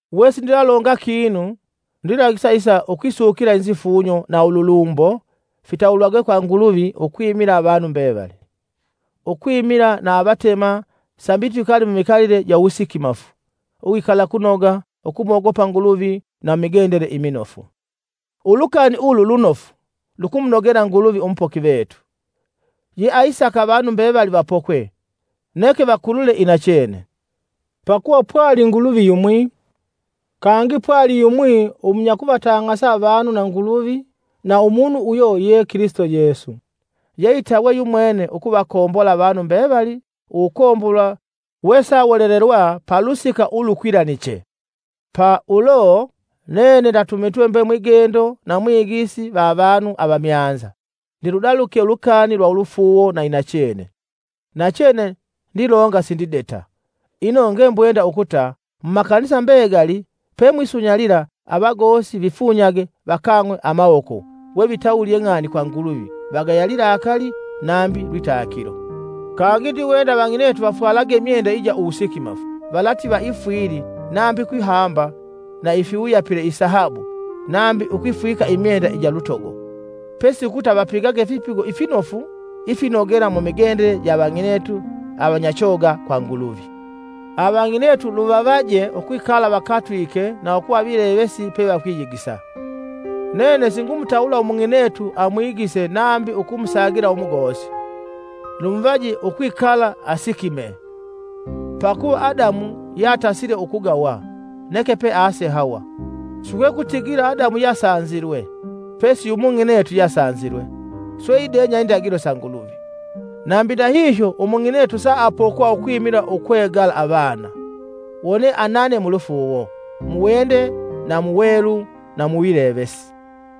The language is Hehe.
Wesindilalonga kinu, ndilagisa isa ukwisukila inofu ukwifunya, ukwisukila na ululumbo, fitawulwagwe kwa Nguluvi ukwimila avanu mbevali, Ukwimila na avatema sambi twikale mumikalile ja uwusikimafu, uwikalakunoga, ukumogopa Nguluvi na mumigendele iminofu. Ulukani ulu lunofu lukumunogela Nguluvi umupoki vetu, yeaisaka avanu mbevali vapokwe neke vakulule inachene. Pakuva kwali Nguluvi yumwi, kangi kwaliyumwi umunyakuvatang'asa avanu Nguluvi na umunu uyo ye Kilisito Yesu, ye itawe yumwene ukuvakombola avanu mbevali uwukombolwa wesawolelelwa palusika ulukwilaniche. Pa ulo, nene ndatumitwe mbe mwigendo na mwigisi va avanu avamyanza ndiludalike ulukani lwa ulufuuwo na inachene. Nachene ndilonga sindideta! Ino ngembwenda ukuta mumakanisa mbegali pemwisunyalila avagosi vifunyage, vakang'we amawoko wevitawulye ng'ani kwa Nguluvi vagaya lilakali nambi lwitakilo. Kangi ndiwenda avang'inetu vafwala imyenda ija wusikimafu valativa ifwili nambi ukwihamba na ifiwuyapile isahabu nambi ukwifwika imyenda ija lutogo, pesi ukuta vapigage ifipigo ifinofu ifinogela mumigendele ja avang'inetu avanyachoga kwa Nguluvi. Avang'inetu luvavaje ukwikala vakatwike na ukuva vilevesi pevakwiyigisa. Nene singumutawula umung'inetu amwigise nambi ukumusagila umugosi, lumuvaje ukwikala asikimee. Pakuva Adamu yeatasile ukugawa, neke pease Hawa. Sikwekutigila Adamu yeasanjilwe, pesi yu mung'inetu yeasanjilwe, swe idenya indagilo sa Nguluvi. Nambi ndahihyo umung'inetu saapokwa ukwimila ukwegala avana, wone anane mulufuuwo, muwende na muwelu na muwilevesi.